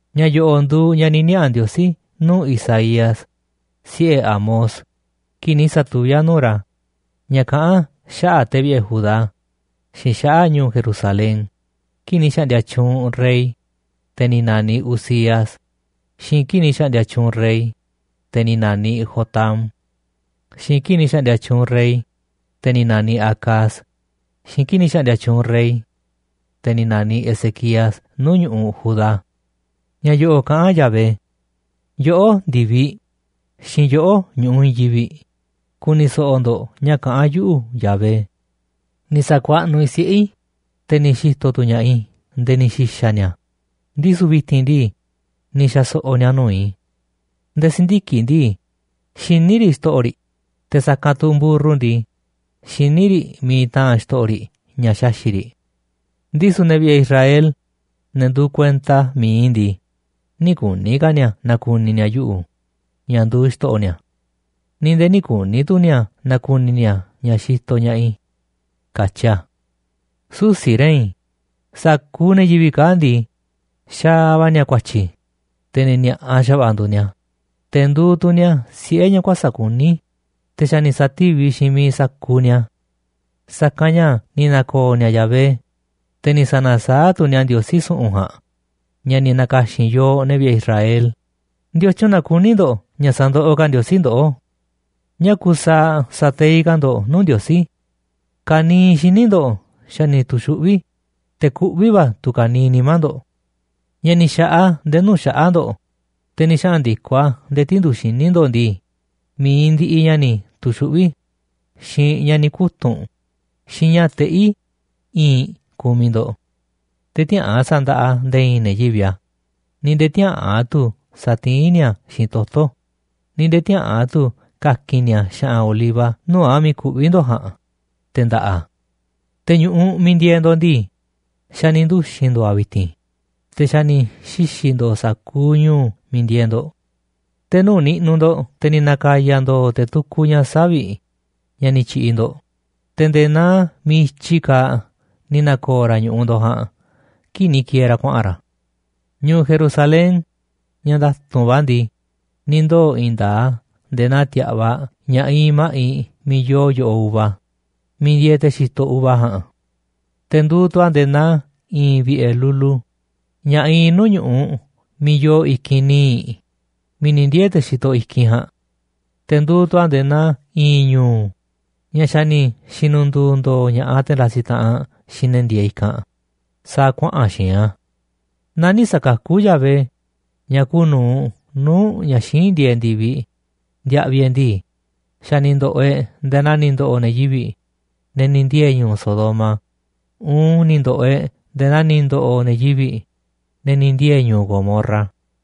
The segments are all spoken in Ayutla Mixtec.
Ña̱ yo̱ꞌo̱ꞌ nduuꞌ ña̱ ni̱ niaꞌa̱ Ndiosí nuu̱ꞌ Isaías, siꞌe̱ Amoz, kii̱ꞌ ni̱ sa̱tuví a̱ nuu̱ꞌ ra̱ ña̱ kaꞌán a̱ xaꞌa̱ꞌ te̱ vi̱ꞌe̱ Judá xiinꞌ xaꞌa̱ꞌ ñu̱u̱ Jerusalén kii̱ꞌ ni̱ xa̱ꞌndi̱a̱ tyuunꞌ rey, te̱ ni̱ na̱niꞌ Uzías, xiinꞌ kii̱ꞌ ni̱ xa̱ꞌndi̱a̱ tyuunꞌ rey, te̱ ni̱ na̱niꞌ Jotam, xiinꞌ kii̱ꞌ ni̱ xa̱ꞌndi̱a̱ tyuunꞌ rey, te̱ ni̱ na̱niꞌ Acaz, xiinꞌ kii̱ꞌ ni̱ xa̱ꞌndi̱a̱ tyuunꞌ rey, te̱ ni̱ na̱niꞌ Ezequías nuu̱ꞌ ñu̱ꞌuꞌ Judá. Ña̱ yo̱ꞌo̱ kaꞌán Yahvé: “Yoꞌó, ndi̱viꞌ, xiinꞌ yoꞌó, ñu̱ꞌuꞌ i̱i̱n yivi̱ꞌ, ku̱ni̱ so̱ꞌo̱ ndo̱ꞌ ña̱ kaꞌán yuꞌu̱, Yahvé. Ni̱ sa̱kuaꞌnuꞌ i̱ siꞌe̱ i̱, te̱ ni̱ xi̱to̱ tu̱ ña̱ꞌaꞌ i̱ nde̱e̱ ni̱ xi̱xa̱ ni̱a̱, ndisu̱ vi̱ti̱n ndii, ni̱ xa̱so̱ꞌo̱ ni̱a̱ nuu̱ꞌ i̱. Nde̱e̱ si̱ndiki̱ꞌ ndii, xiní riꞌ xto̱ꞌo̱ riꞌ, te̱ sa̱kanꞌ tu̱ mburru ndii, xiní riꞌ miiꞌ taa̱nꞌ xto̱ꞌo̱ riꞌ ña̱ xaxi̱ꞌ riꞌ. Ndisu̱ ne̱ vi̱ꞌe̱ Israel, ne̱ nduuꞌ kuenta mi̱iꞌ i̱ ndii, nï̱ kuni̱ ka̱ ni̱a̱ na̱ku̱ni̱ ni̱a̱ yuꞌu̱ ña̱ nduuꞌ xto̱ꞌo̱ ni̱a̱. Ni̱ nde̱e̱ nï̱ kuni̱ tu̱ ni̱a̱ na̱ku̱ni̱ ni̱a̱ ña̱ xitoꞌ ña̱ꞌaꞌ i̱”, katyi a̱. Susi̱ re̱i̱n, sa̱kuuꞌ ne̱ yivi̱ꞌ kaa̱ꞌ ndii, xaaꞌ va̱ ni̱a̱ ku̱a̱tyi̱, te̱ ne̱ ni̱a̱ꞌa xa̱va̱ꞌa̱ nduuꞌ ni̱a̱, te̱ nduuꞌ tu̱ ni̱a̱ siꞌe̱ ña̱ kuäsa̱ꞌ kuní, te̱ xa̱ ni̱ sa̱tíviꞌ xiinꞌ miiꞌ sa̱kuuꞌ ni̱a̱. Sa̱kanꞌ ña̱ ni̱ na̱ko̱o̱ ni̱a̱ Yahvé, te̱ ni̱ sa̱na̱saáꞌ tu̱ ni̱a̱ Ndiosí su̱ꞌu̱n ja̱a̱nꞌ ña̱ ni̱ na̱ka̱xi̱n yooꞌ, ne̱ vi̱ꞌe̱ Israel. ¿Ndiotyun na kuní ndo̱ꞌ ña̱ sa̱ndoꞌoꞌ ka̱ Ndiosí ndoꞌó? ¿Ñáá kusaaꞌ sa̱teiꞌ ka̱ ndo̱ꞌ nuu̱ꞌ Ndiosí? Ka̱niiꞌ xíniꞌ ndo̱ꞌ xa̱ ni̱ tu̱xuꞌví, te̱ kuꞌví va̱ tu̱ ka̱niiꞌ nimá ndo̱ꞌ. Ña̱ ni̱ xa̱ꞌaꞌ a̱ nde̱e̱ nuu̱ꞌ xaꞌa̱ꞌ ndo̱ꞌ, te̱ ni̱ xaꞌa̱n ndi̱koꞌ a̱ nde̱e̱ tindu̱ꞌ xíniꞌ ndo̱ꞌ ndii, mi̱iꞌ ndiꞌiꞌ ña̱ ni̱ tu̱xuꞌví, xiinꞌ ña̱ ni̱ kutu̱nꞌ, xiinꞌ ña̱ teꞌí i̱i̱nꞌ kumiꞌ ndo̱ꞌ. Te̱ tiäꞌa̱an sa̱ndaꞌa nde̱e̱ i̱i̱n ne̱ yivi̱ꞌ a̱, ni̱ nde̱e̱ tiäꞌa̱an tu̱ sa̱tiín ni̱a̱ a̱ xiinꞌ toto̱, ni̱ nde̱e̱ tiäꞌa̱an tu̱ ka̱ki̱n ni̱a̱ xa̱ꞌa̱n oliva nuu̱ꞌ a̱ miiꞌ kuꞌví ndo̱ꞌ ja̱a̱nꞌ, te̱ nda̱ꞌa̱ a̱. Te̱ ñu̱ꞌuꞌ miiꞌ ndieeꞌ ndo̱ꞌ ndii, xa̱ ni̱ nduxi̱n ndo̱o̱ a̱ vi̱ti̱n, te̱ xa̱ ni̱ xixi̱ ndo̱o̱ sa̱kuuꞌ ñu̱u̱ miiꞌ ndieeꞌ ndo̱ꞌ. Te̱ nuu̱ꞌ niꞌnuꞌ ndo̱ꞌ te̱ ni̱ na̱ka̱ya̱ ndo̱o̱ te̱ tukuꞌ ña̱ savi̱ꞌ ña̱ ni̱ tyi̱ꞌi̱ ndo̱ꞌ, te̱ nde̱e̱ naa miiꞌ i̱tyi kaaꞌ ni̱ na̱ko̱o̱ ra̱ ñu̱ꞌuꞌ ndo̱ꞌ ja̱a̱nꞌ kii̱ꞌ ni̱ ki̱e̱e̱ ra̱ kuaꞌa̱n ra̱. Ñu̱u̱ Jerusalén, ña̱ nda̱tu̱nꞌ va̱ ndii, ni̱ ndoo̱ i̱i̱n nda̱a̱ꞌ a̱ nde̱e̱ naa ti̱a̱ꞌvaꞌ ña̱ iinꞌ ma̱ꞌiꞌ miiꞌ yoo yo̱ꞌoꞌ uva miiꞌ ndieeꞌ te̱ xitoꞌ uva ja̱a̱nꞌ. Te̱ nduuꞌ tu̱ a̱ nde̱e̱ naa i̱i̱n vi̱ꞌe̱ lulu ña̱ iinꞌ nuu̱ꞌ ñu̱ꞌuꞌ miiꞌ yoo i̱kinꞌ níiꞌ miiꞌ ni̱ ndiee̱ te̱ xitoꞌ i̱kinꞌ ja̱a̱nꞌ. Te̱ nduuꞌ tu̱ a̱ nde̱e̱ naa i̱i̱n ñu̱u̱ ña̱ xa̱ ni̱ xi̱nu̱ndu̱u̱ ndo̱o̱ ña̱ꞌaꞌ te̱ ndasiꞌ taꞌanꞌ xiinꞌ ne̱ ndieeꞌ i̱kanꞌ sa̱a̱ kuaꞌa̱n xi̱i̱nꞌ a̱. Naaꞌ nï̱ sa̱kakú Yahvé, ña̱ kuuꞌ nu̱uꞌ nuu̱ꞌ ña̱ xíinꞌ ndieeꞌ ndi̱viꞌ, ndiaꞌviꞌ e̱ꞌ ndii, xa̱ ni̱ ndo̱ꞌo̱ e̱ꞌ nde̱e̱ naa ni̱ ndo̱ꞌo̱ ne̱ yivi̱ꞌ, ne̱ ni̱ ndiee̱ ñu̱u̱ Sodoma uun ni̱ ndo̱ꞌo̱ e̱ꞌ nde̱e̱ naa ni̱ ndo̱ꞌo̱ ne̱ yivi̱ꞌ, ne̱ ni̱ ndiee̱ ñu̱u̱ Gomorra.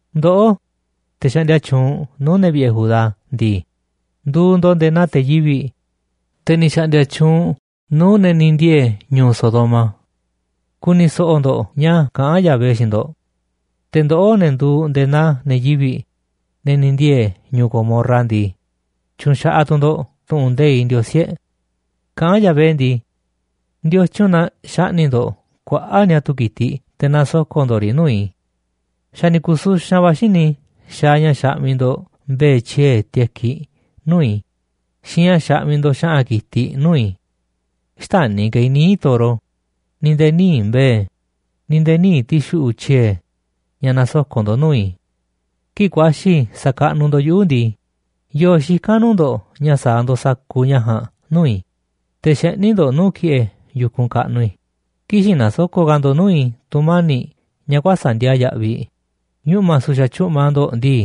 Ndoꞌó, te̱ xaꞌndia tyuunꞌ nuu̱ꞌ ne̱ vi̱ꞌe̱ Judá ndii, nduuꞌ ndo̱ꞌ nde̱e̱ naa te̱ yivi̱ꞌ, te̱ ni̱ xa̱ꞌndi̱a̱ tyuunꞌ nuu̱ꞌ ne̱ ni̱ ndiee̱ ñu̱u̱ Sodoma. Ku̱ni̱ so̱ꞌo̱ ndo̱ꞌ ña̱ kaꞌán Yahvé xiinꞌ ndo̱ꞌ. Te̱ ndoꞌó, ne̱ nduuꞌ nde̱e̱ naa ne̱ yivi̱ꞌ, ne̱ ni̱ ndieeꞌ ñu̱u̱ Gomorra ndii, tyu̱nxaꞌaꞌ tu̱ ndo̱ꞌ tu̱ꞌu̱n nde̱iꞌ Ndiosí e̱ꞌ. Kaꞌán Yahvé ndii: “¿Ndiotyun na xaꞌni̱ꞌ ndo̱ꞌ kuaꞌa̱ꞌ niatu̱ ki̱tiꞌ te̱ nasoko̱ꞌ ndo̱ꞌ riꞌ nuu̱ꞌ i̱? Xa̱ ni̱ ku̱suxanꞌ va̱ xíniꞌ i̱ xaaꞌ ña̱ xaꞌmiꞌ ndo̱ꞌ mbe̱e̱ tyiee̱ tekiꞌ nuu̱ꞌ i̱ xiinꞌ ña̱ xaꞌmiꞌ ndo̱ꞌ xa̱ꞌa̱n ki̱tiꞌ nuu̱ꞌ i̱. Xtäni̱ ka̱ i̱ níiꞌ toro, ni̱ nde̱e̱ níiꞌ mbe̱e̱, ni̱ nde̱e̱ níiꞌ ti̱xuꞌu̱ꞌ tyiee̱ ña̱ nasoko̱ꞌ ndo̱ꞌ nuu̱ꞌ i̱. Kii̱ꞌ ku̱a̱xi̱ sa̱kaꞌnuꞌ ndo̱ꞌ yuꞌu̱ ndii, ¿yo̱o̱ xikán nuu̱ꞌ ndo̱ꞌ ña̱ sa̱a̱ ndo̱ꞌ sa̱kuuꞌ ña̱ ja̱a̱nꞌ nuu̱ꞌ i̱, te̱ xeꞌní ndo̱ꞌ nuu̱ꞌ ki̱ꞌe̱ yu̱kunꞌ kaꞌnuꞌ i̱? Kï̱xi̱n na̱soko̱ꞌ ka̱ ndo̱ꞌ nuu̱ꞌ i̱ tu̱mani̱ꞌ ña̱ kuäsa̱ꞌ ndiaa yaꞌviꞌ. Ñuꞌma̱ su̱xa̱ tyu̱ꞌma ndo̱ꞌ ndii,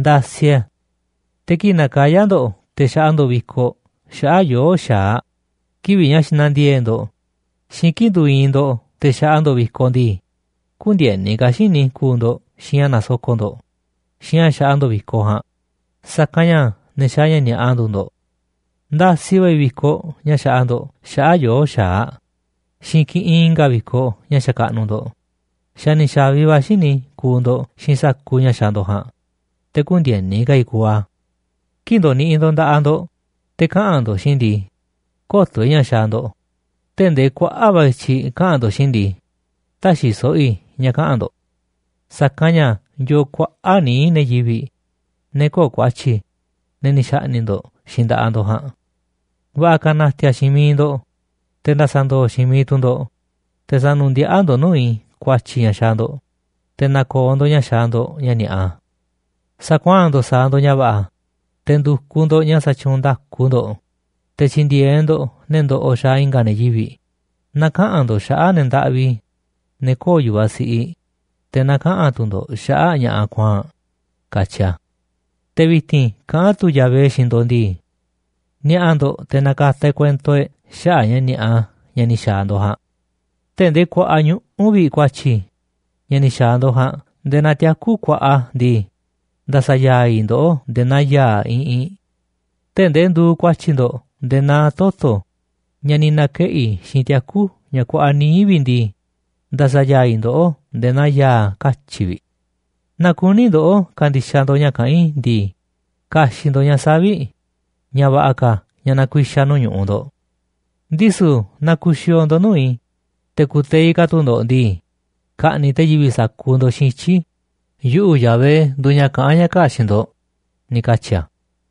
ndasiꞌ e̱ a̱. Te̱ kii̱ꞌ nakayá ndo̱ꞌ te̱ xaꞌa ndo̱ꞌ vi̱koꞌ xaꞌa̱ꞌ yoo̱ꞌ xa̱aꞌ kivi̱ꞌ ña̱ xina̱ndiee̱ꞌ ndo̱ꞌ xiinꞌ kii̱ꞌ nduuꞌ iinꞌ ndo̱ꞌ te̱ xaꞌa ndo̱ꞌ vi̱koꞌ ndii, kündieni ka̱ xíniꞌ i̱ kuuꞌ ndo̱ꞌ xiinꞌ ña̱ nasoko̱ꞌ ndo̱ꞌ xiinꞌ ña̱ xaꞌa ndo̱ꞌ vi̱koꞌ ja̱a̱nꞌ, sa̱kanꞌ ña̱ ne̱ xaaꞌ ña̱ ni̱a̱ꞌa nduuꞌ ndo̱ꞌ. Ndasiꞌ va̱ i̱ vi̱koꞌ ña̱ xaꞌa ndo̱ꞌ xaꞌa̱ꞌ yoo̱ꞌ xa̱aꞌ xiinꞌ kiꞌinꞌ i̱nga̱ vi̱koꞌ ña̱ xakaꞌnuꞌ ndo̱ꞌ, xa̱ ni̱ xa̱vi va̱ xíniꞌ i̱ kuuꞌ ndo̱ꞌ xiinꞌ sa̱kuuꞌ ña̱ xaaꞌ ndo̱ꞌ ja̱a̱nꞌ, te̱ kündieni ka̱ i̱ kuuꞌ a̱. ’Kii̱ꞌ ndoniꞌiꞌ ndo̱ꞌ nda̱ꞌaꞌ ndo̱ꞌ te̱ kaꞌa̱n ndo̱ꞌ xiinꞌ i̱ ndii, kö̱to̱ i̱ ña̱ xaaꞌ ndo̱ꞌ. Tee̱ꞌ ndee kuaꞌa̱ꞌ va̱ i̱tyiꞌ kaꞌa̱n ndo̱ꞌ xiinꞌ i̱ ndii, tä̱xi̱ so̱ꞌo̱ i̱ ña̱ kaꞌa̱n ndo̱ꞌ, sa̱kanꞌ ña̱ yoo kuaꞌa̱ꞌ níiꞌ ne̱ yivi̱ꞌ, ne̱ köo̱ꞌ ku̱a̱tyi̱, ne̱ ni̱ xa̱ꞌni̱ꞌ ndo̱ꞌ xiinꞌ nda̱ꞌaꞌ ndo̱ꞌ ja̱a̱nꞌ. Va̱ꞌa̱ ka̱ na̱ti̱a̱ xiinꞌ miiꞌ ndo̱ꞌ, te̱ nda̱sa̱ ndo̱o̱ xiinꞌ miiꞌ tu̱ ndo̱ꞌ, te̱ sa̱nu̱ndiaꞌá ndo̱ꞌ nuu̱ꞌ i̱ ku̱a̱tyi̱ ña̱ xaaꞌ ndo̱ꞌ, te̱ na̱ko̱o̱ ndo̱ꞌ ña̱ xaaꞌ ndo̱ꞌ ña̱ ni̱a̱ꞌa. Sa̱kuaa̱n ndo̱ꞌ sa̱a̱ ndo̱ꞌ ña̱ va̱ꞌa̱, te̱ ndu̱kuꞌ ndo̱ꞌ ña̱ sa̱tyuunꞌ nda̱ku ndo̱ꞌ, te̱ tyi̱ndi̱e̱eꞌ ndo̱ꞌ ne̱ ndoꞌoꞌ xaaꞌ i̱nga̱ ne̱ yivi̱ꞌ, na̱kaꞌa̱n ndo̱ꞌ xaꞌa̱ꞌ ne̱ ndaꞌvi, ne̱ köo̱ꞌ yu̱vaꞌ siꞌiꞌ, te̱ na̱kaꞌa̱n tu̱ ndo̱ꞌ xaꞌa̱ꞌ ña̱ꞌaꞌ kuaa̱nꞌ”, katyi a̱. Te̱ vi̱ti̱n kaꞌán tu̱ Yahvé xiinꞌ ndo̱ꞌ ndii: “Ni̱a̱ꞌa̱ ndo̱ꞌ te̱ na̱ka̱ta̱ e̱ꞌ kuento e̱ꞌ xaꞌa̱ꞌ ña̱ ni̱a̱ꞌa ña̱ ni̱ xa̱a̱ ndo̱ꞌ ja̱a̱nꞌ. Tee̱ꞌ ndee kuaꞌa ñuꞌu̱ vi̱ꞌ ku̱a̱tyi̱ ña̱ ni̱ xa̱a̱ ndo̱ꞌ ja̱a̱nꞌ nde̱e̱ naa tiaku̱ kuaꞌa ndii, nda̱sa̱ ya̱a̱ i̱ ndoꞌó nde̱e̱ naa ya̱a̱ iꞌinꞌ. Tee̱ꞌ ndee nduuꞌ ku̱a̱tyi̱ ndo̱ꞌ nde̱e̱ naa toto̱ ña̱ ni̱ na̱keꞌi̱ xiinꞌ tiaku̱ ña̱ kuaꞌa níiꞌ vi̱ꞌ ndii, nda̱sa̱ ya̱a̱ i̱ ndoꞌó nde̱e̱ naa ya̱a̱ katyi̱ꞌ vi̱ꞌ. Naaꞌ kuní ndoꞌó ka̱ndi̱xaꞌ ndo̱ꞌ ña̱ kaꞌán i̱ ndii, ka̱xi̱ꞌ ndo̱ꞌ ña̱ savi̱ꞌ ña̱ va̱ꞌa̱ ka̱ ña̱ na̱ku̱i̱xa̱ nuu̱ꞌ ñu̱ꞌuꞌ ndo̱ꞌ. Ndisu̱ naaꞌ ku̱xi̱o̱o̱ ndo̱ꞌ nuu̱ꞌ i̱, te̱ ku̱teiꞌ ka̱ tu̱ ndo̱ꞌ ndii, ka̱ꞌni̱ꞌ te̱ yivi̱ꞌ sa̱kuuꞌ ndo̱ꞌ xiinꞌ ityi̱. Yuꞌu̱, Yahvé, nduuꞌ ña̱ kaꞌán ña̱ kaa̱ꞌ xiinꞌ ndo̱ꞌ”, ni̱ katyi̱ a̱.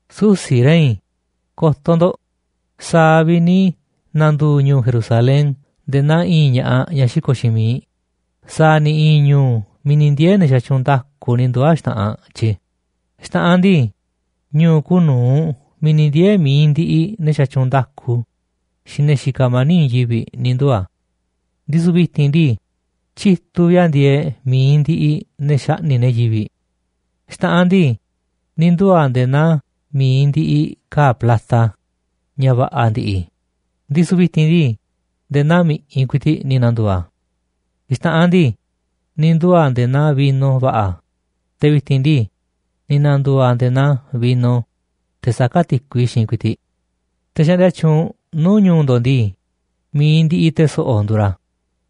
Susi̱ rei̱n, ko̱to̱ ndo̱ꞌ, sa̱a̱ vi̱ꞌ ni̱ na̱ndu̱u̱ ñu̱u̱ Jerusalén nde̱e̱ naa i̱i̱n ña̱ꞌaꞌ ñaꞌ xiko̱ꞌ xiinꞌ miiꞌ sa̱a̱ ni̱ i̱i̱n ñu̱u̱ miiꞌ ni̱ ndiee̱ ne̱ xatyuunꞌ nda̱ku ni̱ nduu̱ a̱ xta̱ꞌanꞌ tyi̱. Xta̱ꞌanꞌ ndii, ñu̱u̱ kuuꞌ nu̱uꞌ miiꞌ ni̱ ndiee̱ mi̱iꞌ ndiꞌiꞌ ne̱ xatyuunꞌ nda̱ku xiinꞌ ne̱ xikaꞌ mani̱ꞌ i̱i̱n yivi̱ꞌ ni̱ nduu̱ a̱. Ndisu̱ vi̱ti̱n ndii, tyituꞌ vi̱ꞌ a̱ ndieeꞌ mi̱iꞌ ndiꞌiꞌ ne̱ xaꞌni̱ꞌ ne̱ yivi̱ꞌ. Xta̱ꞌanꞌ ndii, ni̱ nduu̱ a̱ nde̱e̱ naa mi̱iꞌ ndiꞌiꞌ ka̱a̱ plata ña̱ va̱ꞌa̱ ndi̱ꞌi̱, ndisu̱ vi̱ti̱n ndii, nde̱e̱ naa mi̱ꞌiꞌ ku̱i̱ti̱ꞌ ni̱ na̱ndu̱u̱ a̱. Xta̱ꞌanꞌ ndii, ni̱ nduu̱ a̱ nde̱e̱ naa vino va̱ꞌa̱, te̱ vi̱ti̱n ndii, ni̱ na̱ndu̱u̱ a̱ nde̱e̱ naa vino, teꞌ saká ti̱kui xiinꞌ ku̱i̱ti̱ꞌ. Te̱ xaꞌndia tyuunꞌ nuu̱ꞌ ñu̱u̱ ndo̱ꞌ ndii, mi̱iꞌ ndiꞌiꞌ te̱ so̱ꞌo̱ nduuꞌ ra̱,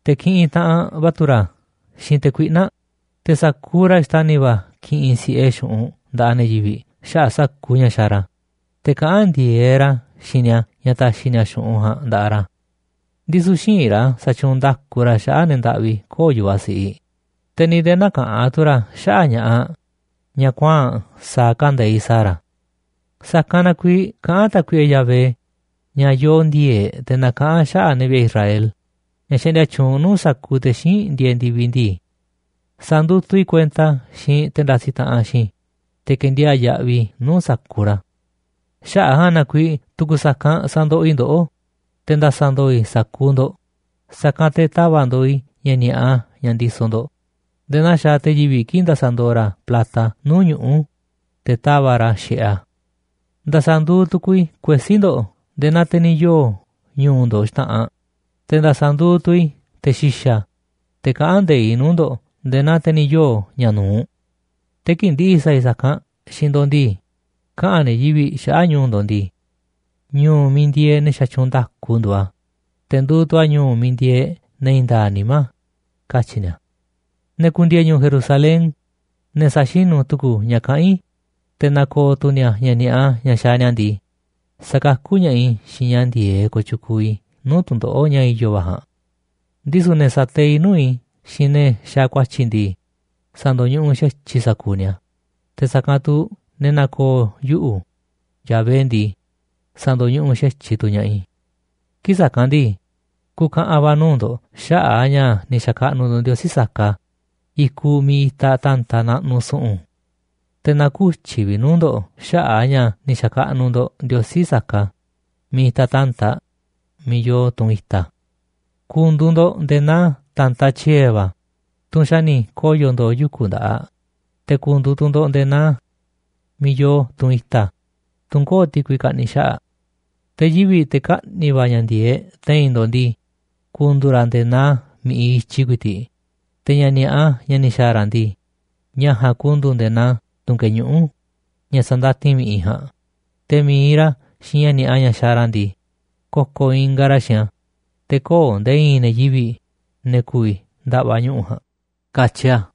te̱ kiꞌinꞌ taꞌanꞌ va̱ tu̱ ra̱ xiinꞌ te̱ kuiꞌna̱ꞌ, te̱ sa̱kuuꞌ ra̱ xtani̱ va̱ ki̱ꞌi̱n si̱ꞌe xu̱ꞌunꞌ nda̱ꞌaꞌ ne̱ yivi̱ꞌ xaꞌa̱ꞌ sa̱kuuꞌ ña̱ xaaꞌ ra̱, te̱ kaꞌán ndi̱e̱eꞌ ra̱ xiinꞌ ni̱a̱ ña̱ ta̱xi̱ ni̱a̱ xu̱ꞌunꞌ ja̱a̱nꞌ nda̱ꞌaꞌ ra̱. Ndisu̱ xïinꞌ ra̱ sa̱tyuunꞌ nda̱ku ra̱ xaꞌa̱ꞌ ne̱ ndaꞌvi köo̱ꞌ yu̱vaꞌ siꞌiꞌ, te̱ ni̱ nde̱e̱ näkaꞌán tu̱ ra̱ xaꞌa̱ꞌ ña̱ꞌaꞌ ñaꞌ kuaa̱nꞌ sa̱a̱ kande̱iꞌ sa̱a̱ ra̱. Sa̱kanꞌ na kuiiꞌ kaꞌán Tákuiꞌe Yahvé, ña̱ yoo ndi̱e̱e̱ꞌ te̱ nakaꞌán a̱ xaꞌa̱ꞌ ne̱ vi̱ꞌe̱ Israel, ña̱ xaꞌndia tyuunꞌ nuu̱ꞌ sa̱kuuꞌ te̱ xíinꞌ ndieeꞌ ndi̱viꞌ ndii: “Sa̱ndutuꞌ i̱ kuenta xiinꞌ te̱ ndasiꞌ taꞌanꞌ xiinꞌ i̱, te̱ ke̱ndiaa̱ꞌ yaꞌviꞌ i̱ nuu̱ꞌ sa̱kuuꞌ ra̱. Xaꞌa̱ꞌ a̱ ja̱a̱nꞌ na kuiiꞌ tu̱ku̱ sa̱kanꞌ sa̱ndoꞌoꞌ i̱ ndoꞌó, te̱ nda̱sa̱ ndo̱o̱ i̱ sa̱kuuꞌ ndo̱ꞌ, sa̱kanꞌ te̱ ta̱va̱ꞌ ndooꞌ i̱ ña̱ ni̱a̱ꞌa ña̱ ndisoꞌ ndo̱ꞌ nde̱e̱ naa xaaꞌ te̱ yivi̱ꞌ kii̱ꞌ ndasaꞌ ndooꞌ ra̱ plata nuu̱ꞌ ñuꞌu̱, te̱ tava̱ꞌ ra̱ xi̱ꞌeꞌ a̱. Nda̱sa̱ nduuꞌ tu̱ku̱u̱ i̱ kuesí ndo̱ꞌ nde̱e̱ naa te̱ ni̱ yoo̱ ñu̱u̱ ndo̱ꞌ xta̱ꞌanꞌ, te̱ nda̱sa̱ nduuꞌ tu̱ i̱ te̱ xi̱xa̱, te̱ kaꞌán nde̱iꞌ nuu̱ꞌ ñu̱u̱ ndo̱ꞌ nde̱e̱ naa te̱ ni̱ yoo̱ ña̱ nu̱uꞌ. Te̱ kii̱ꞌ ndi̱ꞌi̱ sa̱a̱ i̱ sa̱kanꞌ xiinꞌ ndo̱ꞌ ndii, kaꞌa̱n ne̱ yivi̱ꞌ xaꞌa̱ꞌ ñu̱u̱ ndo̱ꞌ ndii: Ñu̱u̱ miiꞌ ndieeꞌ ne̱ xatyuunꞌ nda̱ku nduuꞌ a̱, te̱ nduuꞌ tu̱ a̱ ñu̱u̱ miiꞌ ndieeꞌ ne̱ i̱i̱n nda̱a̱ꞌ nimá, katyi̱ ni̱a̱. ’Ne̱ ku̱ndi̱e̱e̱ ñu̱u̱ Jerusalén, ne̱ sa̱xinu̱ tu̱ku̱u̱ ña̱ kaꞌán i̱, te̱ na̱ko̱o̱ tu̱ ni̱a̱ ña̱ ni̱a̱ꞌa ña̱ xaaꞌ ni̱a̱ ndii, sa̱kakú ña̱ꞌaꞌ i̱ xiinꞌ ña̱ ndi̱e̱eꞌ kooꞌ tyukuuꞌ i̱ nuu̱ꞌ tu̱ndoꞌo̱ꞌ ña̱ i̱yo̱ va̱ ja̱a̱nꞌ. Ndisu̱ ne̱ sa̱teiꞌ nuu̱ꞌ i̱ xiinꞌ ne̱ xaaꞌ ku̱a̱tyi̱ ndii, sa̱ndo̱ñuꞌuꞌ xa̱tyiꞌ i̱ sa̱kuuꞌ ni̱a̱, te̱ sa̱kanꞌ tu̱ ne̱ na̱ko̱o̱ yuꞌu̱, Yahvé ndii, sa̱ndo̱ñuꞌuꞌ xa̱tyiꞌ tu̱ ña̱ꞌaꞌ i̱. ’Kii̱ꞌ sa̱kanꞌ ndii, ku̱ka̱ꞌa̱n va̱ nuu̱ꞌ ndo̱ꞌ xaꞌa̱ꞌ a̱ ña̱ ni̱ xa̱kaꞌnuꞌ ndo̱ꞌ ndiosí saka i̱kuꞌ miiꞌ itaꞌ ta̱ntaꞌ naꞌnuꞌ su̱ꞌu̱n. Te̱ na̱kutyi̱ vi̱ꞌ nuu̱ꞌ ndo̱ꞌ xaꞌa̱ꞌ a̱ ña̱ ni̱ xa̱kaꞌnuꞌ ndo̱ꞌ ndiosí saka miiꞌ itaꞌ ta̱ntaꞌ, miiꞌ yoo tunꞌ i̱ta̱. Ku̱ndu̱u̱ ndo̱ꞌ nde̱e̱ naa ta̱ntaꞌ tyiee̱ va̱, tunꞌ xa̱ ni̱ koyo̱ ndo̱o̱ yuku̱ nda̱ꞌaꞌ, te̱ ku̱ndu̱u̱ tu̱ ndo̱ꞌ nde̱e̱ naa miiꞌ yoo tunꞌ i̱ta̱, tunꞌ köo̱ꞌ ti̱kui kaꞌni̱ xaꞌa̱ꞌ. Te̱ yivi̱ꞌ, te̱ kaꞌni̱ va̱ ña̱ ndi̱e̱eꞌ te̱i̱n ndo̱ꞌ ndii, ku̱ndu̱u̱ ra̱ nde̱e̱ naa mi̱ꞌiꞌ i̱tyi ku̱i̱ti̱ꞌ, te̱ ña̱ ni̱a̱ꞌa, ña̱ ni̱ xa̱a̱ ra̱ ndii, ña̱ ja̱a̱nꞌ ku̱ndu̱u̱ nde̱e̱ naa tu̱n keñuꞌú, ña̱ sa̱ndatin mi̱ꞌiꞌ ja̱a̱nꞌ, te̱ mi̱iꞌ ra̱ xiinꞌ ña̱ ni̱a̱ꞌa ña̱ xaaꞌ ra̱ ndii, ko̱ko̱ ingaꞌ ra̱ xiinꞌ a̱, te̱ köo̱ꞌ nde̱e̱ i̱i̱n ne̱ yivi̱ꞌ, ne̱ ku̱vi̱ nda̱ꞌva̱ ñuꞌu̱ ja̱a̱nꞌ”, katyi a̱.